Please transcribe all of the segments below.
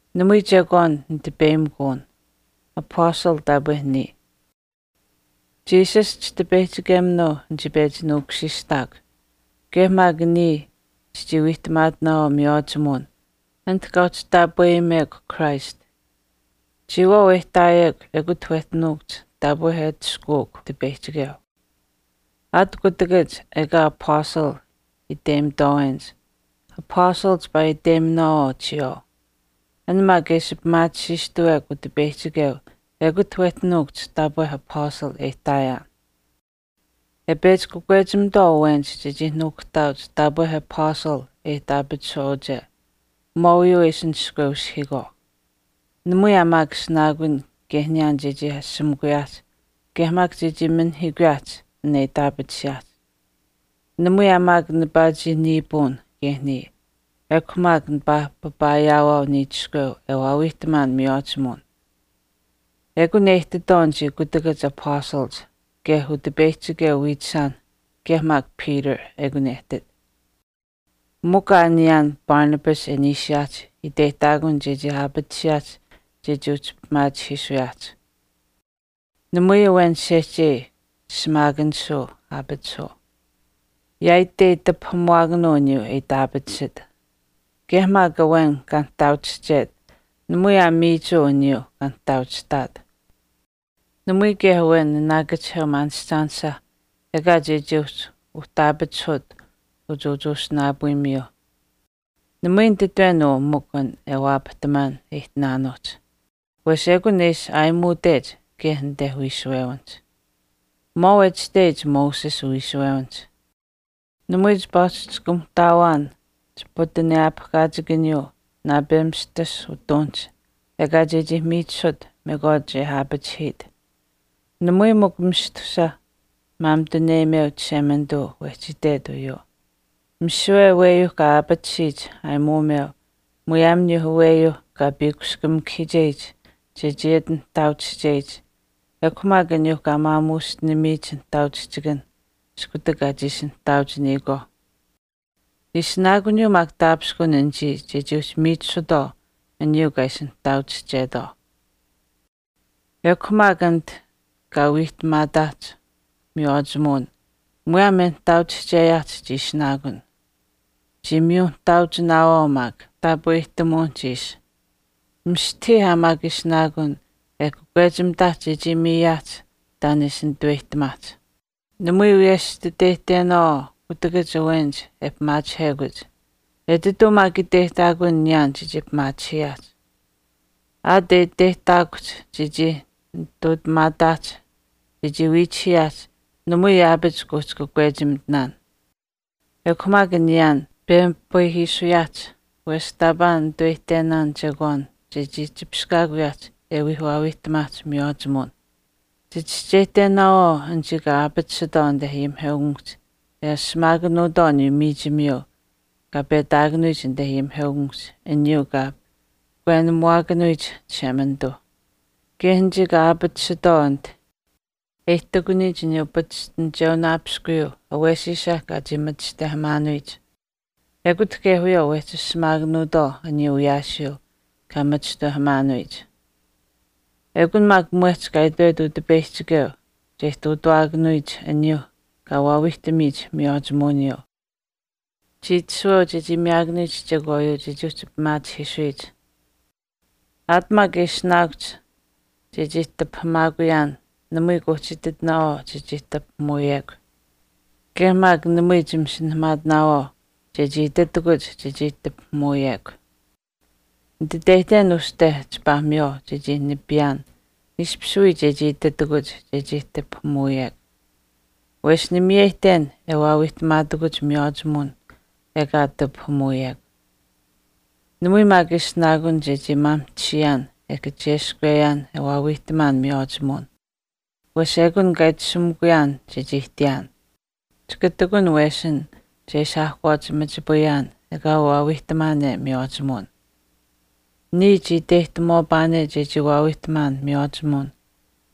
Namui chekwaan nitipeyimikuun. Apastal taapwe niya. Jesus Chitipeyihchikeminuu nichii pechi nuukushiishtaakw. Kaye maak niya chichii wiihtamaatinaawaau miywaachimuwin ati kaa uhchi taapweyimekw Christ. Chiyawaau e ihtaayekw ekut wehchi nuukuhch taapwe e atushkuuk Utipeyihchikeu. Aat kutakach ekaa apastal iteyimitwaawenich, apastal chipaa iteyiminaawaau chiyawaau. An maak e ishi pimaatisiistuwekw Utipeyihchikeu ekut wehchi nuukuhch taapwe apastal e ihtaayaan. E pechi kakwechimitwaau awenich chechii nuukuhtaauch taapwe apastal e itaapatisuwaauche, maauyuu e ishi nishkweushihiikwaau. Namui aa maak ishinaakun kaye niyaan chechii ashamikuyaahch kaye maak chechii minihiikuyaahch an e itaapatisiyaahch. Namui aa maak nipaa chii niipuun kaye niya ekw maak nipaa papaa ayaawaau niichiskweu e waawiihtamaan miywaachimuwin. Ekun e ihtitwaau anichii kutakach apastalach kaye Utipeyihchikeu wiichishaanh kaye maak Peter ekun e ihtit. Mikw aa niyaan Barnabas e niishiyaahch iteyihtaakun chechii aapatisiyaahch chechii uhchi pimaachihiisuyaahch. Namui awen sehchei shimaakanishuu aapatisuu. Yaaitei tipahamuwaakanuu aniyuu e itaapatisit. Kaye maak awen kaa nihtaauchihchet namui aa miichuu aniyuuh kaa nihtaauchihtaat. Namui kaye awen naanaakachiheu maanishchaanisha, ekaa chechii uhchi uhtaapachihut uchuuchuusinaapuumiyuuh. Namui nititwen uu mikw an e waapahtamaan e ihtinaanuuhch. Wesh ekun e ishi aayimuutech kaye anite wiishuwewinihch. Maau e itashteyich Moses uwiishuwewinihch, “Namui chipaa uhchi chikamuhtaawaan chiputenewaapahkaachikaniyuu naapemistus utuunihch ekaa chechii miichisut mekwaach e aapachihiit.” Namui mikw mistusa maamituneyimeu Chishemanituu wehchi itwet uyuu. Misiwe aweyuuh kaa aapatisiyich aayimuumeu muyaam aniyuuh aweyuuh kaa piikushkamikahiicheyich chechii ati nihtaauchicheyich ekw maak aniyuu kaa maamuushtinamiyich nihtaauchihchikanh iskutak kaa chiishi nihtaauchiniyikwaauh. Ishinaakuniyuu maak taapishkun anichii chechii uhchi miichisutwaau aniyuu kaa ishi nihtaauchihchetwaau. Ekw maak anit kaa wiihtamaataahch miywaachimuwin muyaam e nihtaauchihcheyaahch chii ishinaakun, chimiyunihtaauchinaawaau maak taapwehtamuwinihch ishi. Mistahii aa maak ishinaakun e kakwechimitaahch chechii miyaahch taan e ishi nitaweyihtamaahch. Namui wiyesh chititeyihtenaawaau kutakach awenich e pimaachihekuch. Etituu maak iteyihtaakun niyaan chechii pimaachihiyaahch. Aat e iteyihtaakuhch chechii nitutamaataahch chechii wiichihiyiaahch namui yaapach kuuhchi kakwechimitinaan. Ekw maak niyaan pemipayihiisuyaahch wesh taapaa ninitaweyihtenaan chekwaan chechii chipishkaakuyaahch e wii waawiihtamaahch miywaachimuwin. Chichischeyihtenaawaau anichii kaa aapatisitwaau anite ayimiheukamikuhch e ashamaakanuutwaau aniyuu miichimiyuu kaa petaakanuyich anite ayimiheukamikuhch aniyuu kaa pahkwenamuwaakanuyich Chishemanituu. Kaye anichii kaa aapatisitwaau ati e ihtakuniyich aniyuu pachishtinicheunaapiskuyuu awesiisa kaa chii machishtawehamaanuyich, ekut kaye wiyawaau wehchi ashamaakanuutwaau aniyuu wiyaasiyuu kaa machishtawehamaanuyich. Ekun maak mwehch kaa itwet Utipeyihchikeu che ihtuutawaakanuyich aniyuuh kaa waawiihtamiyich miywaachimuwiniyuu. Chii itashuweu chechii miyaakanuyich chekwaayuu chechii uhchi pimaachihiisuyich. Aat maak e ishinaakuhch chechii tipahamaakuyaan namui kuuhchi ititinaawaau chechii tipahamuuyew. Kaye maak namui chimasinahamaatinaawaau chechii ititakuch chechii tipahamuuyekw. Nititeyihten uste chipaa miywaau chechii nipiyaan ishpish wii chechii ititakuch chechii tipahamuuyekw. Wesh nimiyeyihten e waawiihtamaatakuch miywaachimuwin ekaa tipahamuuyekw. Namui maak ishinaakun chechii mamahtisiyaan e kacheskweyaan e waawiihtamaan miywaachimuwin. Wesh ekun kaa itashumikuyaan chechii ihtiyaan. Chika ihtakun wesin che ishi aahkwaach machipayaan ekaa waawiihtamaane miywaachimuwin. Niya chii iteyihtamuwaapaane chechii waawiihtamaan miywaachimuwin,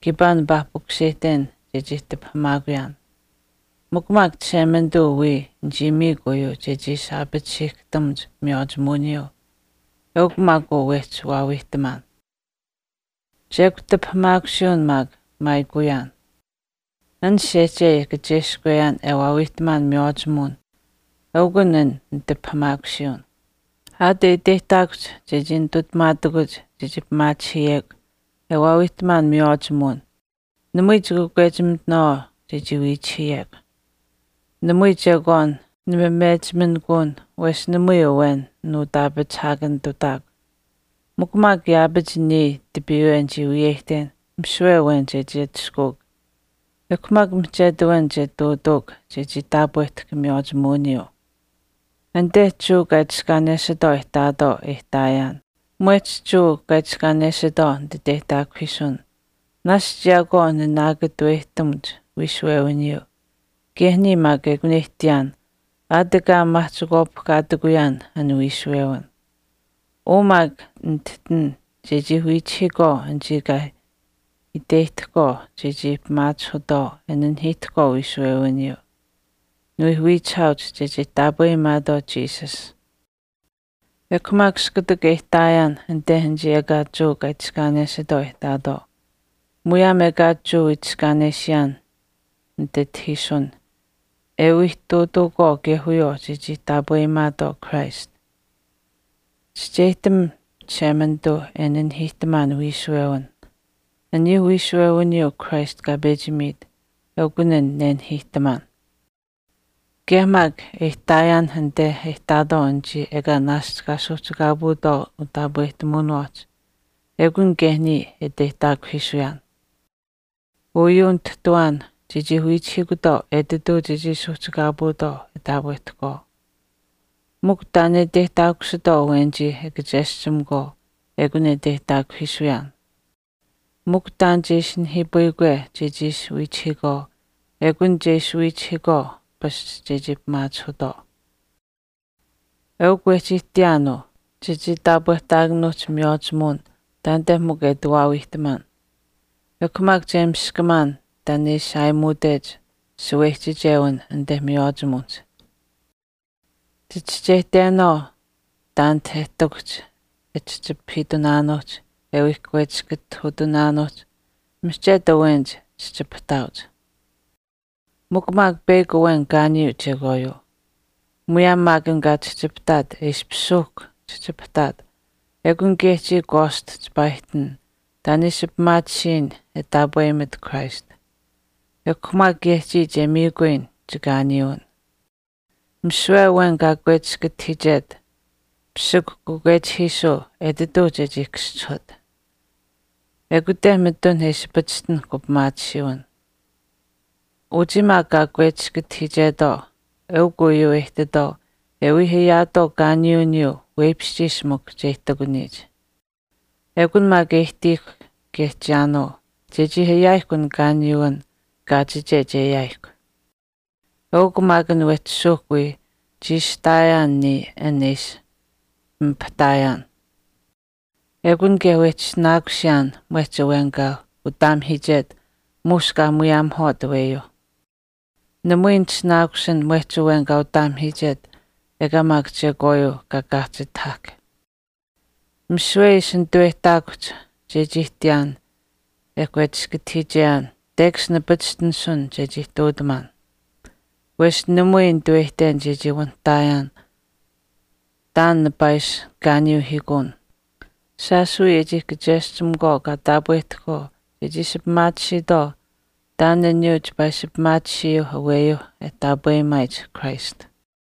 kiipaa nipaa pukuseyihten chechii tipahamaakuyaan. Mikw maak Chishemanituu wiya nichii miikw uyuu chechii ishi aapatisiihkahtamuch miywaachimuwiniyuu eukw maak uu wehchi waawiihtamaan. Chekw tipahamaakusiiwin maak maayikuyaan. An sehchei e kacheskweyaan e waawiihtamaan miywaachimuwin eukun an nitipahamaakusiiwin. Aat e iteyihtaakuhch chechii nitutamaatakuch chechii pimaachihiyekw e waawiihtamaan miywaachimuwin namui chikakwechimitinaawaau chechii wiichihiyekw. Namui chekwaan nimamechiminikuun wesh namui awen nuutaapachihaakanitutaakw. Mikw maak yaapach niya tipiiwe nichii wiyeyihten misiwe awen che wii atushkuuk. Ekw maak mihchetu awen che ihtuutuuk chechii taapwehtahk miywaachimuwiniyuu. Anite Jewa kaa itiskaanesitwaau iinuuch e ihtaatwaau e ihtaayaan, mwehch Jewa iinuu nititeyihtaakuhiisun. Naashch yaakwaau nanaakatuweyihtamuch wiishuwewiniyuu kaye niya maak ekun e ihtiyaan aat ekaa maahchikwaapihkaatikuyaan an wiishuwewin. Uu maak nitihtin chechii wiichihiikwaau anichii kaa iteyihtahkwaau chechii pimaachihutwaau e nanihiihtahkwaau wiishuwewiniyuu. Niwii wiichihaauch chechii taapweyimaatwaau Jesus. Ekw maak iskutak e ihtaayaan anite anichii ekaa Jewa kaa itiskaanesitwaau e ihtaatwaau, muyaam ekaa Jewa itiskaanesiyaan nititahiisun e wii ihtuutuukwaau kaye wiyawaau chechii taapweyimaatwaau Christ. Chischeyihtam Chishemanituu e nanihiihtamaan wiishuwewin, aniyuu wiishuwewiniyuu Christ kaa pechi miit eukun an nenahiihtamaan. Kaye maak e ihtaayaanh anite e ihtaatwaau anichii ekaa naashch kaa suuhchikaapuutwaau utaapwehtamuwiniwaahch ekun kaye niya e iteyihtaakuhiisuyaan. Uyuu nitihtiwaan chechii wiichihiikwaau etituu chechii suuhchikaapuutwaau e taapwehtahkwaau. Mikw taan e iteyihtaakusitwaau awenichii e kacheschimakwaau ekun e iteyihtaakuhiisuyaan. Mikw taan che ishi nihiipayikwe chechii ishi wiichihiikwaau ekun che ishi wiichihiikwaau pasch chechii pimaachihutwaau. Eukw wehchi ihtiyaan uu chechii taapwehtaakanuuhch miywaachimuwin taanite mikw e ati waawiihtamaan. Ekw maak che miskamaan taan e ishi aayimuutech shaweyichichewin anite miywaachimuwinihch. Chichischeyihtenaawaau taanite e ihtakuhch e chihchipahiitunaanuuhch e wii kakwechiskatahuutunaanuuhch, mihchetu awenich chihchipahtaauch. Mikw maak peyakw awen kaaniyuu chekwaayuu. Muyaam maak an kaa chihchipahtaat e ishpish suuhk chihchipahtaat, ekun kaye chiya kwaast chipaa ihtin taan e ishi pimaatisiyin e taapweyimat Christ. Ekw maak kaye chiya che miikuyin chikaaniyuwin. Misiwe awen kaa kakwechiskatihiichet pisikw kakwechipayihiisuu etituu chechii kaschihut. Ekute mitun e ishi pachishtinahk upimaatisiiwin. Uchii maak kaa kakwechiskatihiichetwaau eukw uyuu e ihtitwaau e wii ayaatwaau kaaniyuwiniyuu weipishchiish mikw che ihtakuniyich. Ekun maak e ihtiihkw kaye chiyaanuu chechii ayaayihkw an kaaniyuwin kaachiche che ayaayihkw. Eukw maak an wehchi suuhk wii chiishihtaayaan niya an e ishi pimipahtaayaan. Ekun kaye wehchi ishinaakusiyaan mwehch awen kaa utaamahiichet muush kaa muyaamuhwaat aweyuuh. Namui nitishinaakusin mwehch awen kaa utataamahiichet ekaa maak chekwaayuu kaa kaahchitahahk. Misiwe e ishi nituweyihtaakuhch chechii ihtiyaan e kakwechiskatahiicheyaan tekash nipachishtinisun chechii ihtuutamaan. Wesh namui ninitaweyihten chechii wanihtaayaan taan nipaa ishi kaaniyuuhiikuun shaash wii e chii kacheschimakwaau kaa taapwehtahkwaau che ishi pimaatisiitwaau taan aniyuuh chipaa ishi pimaatisiyuuh aweyuuh e taapweyimaayich Christ.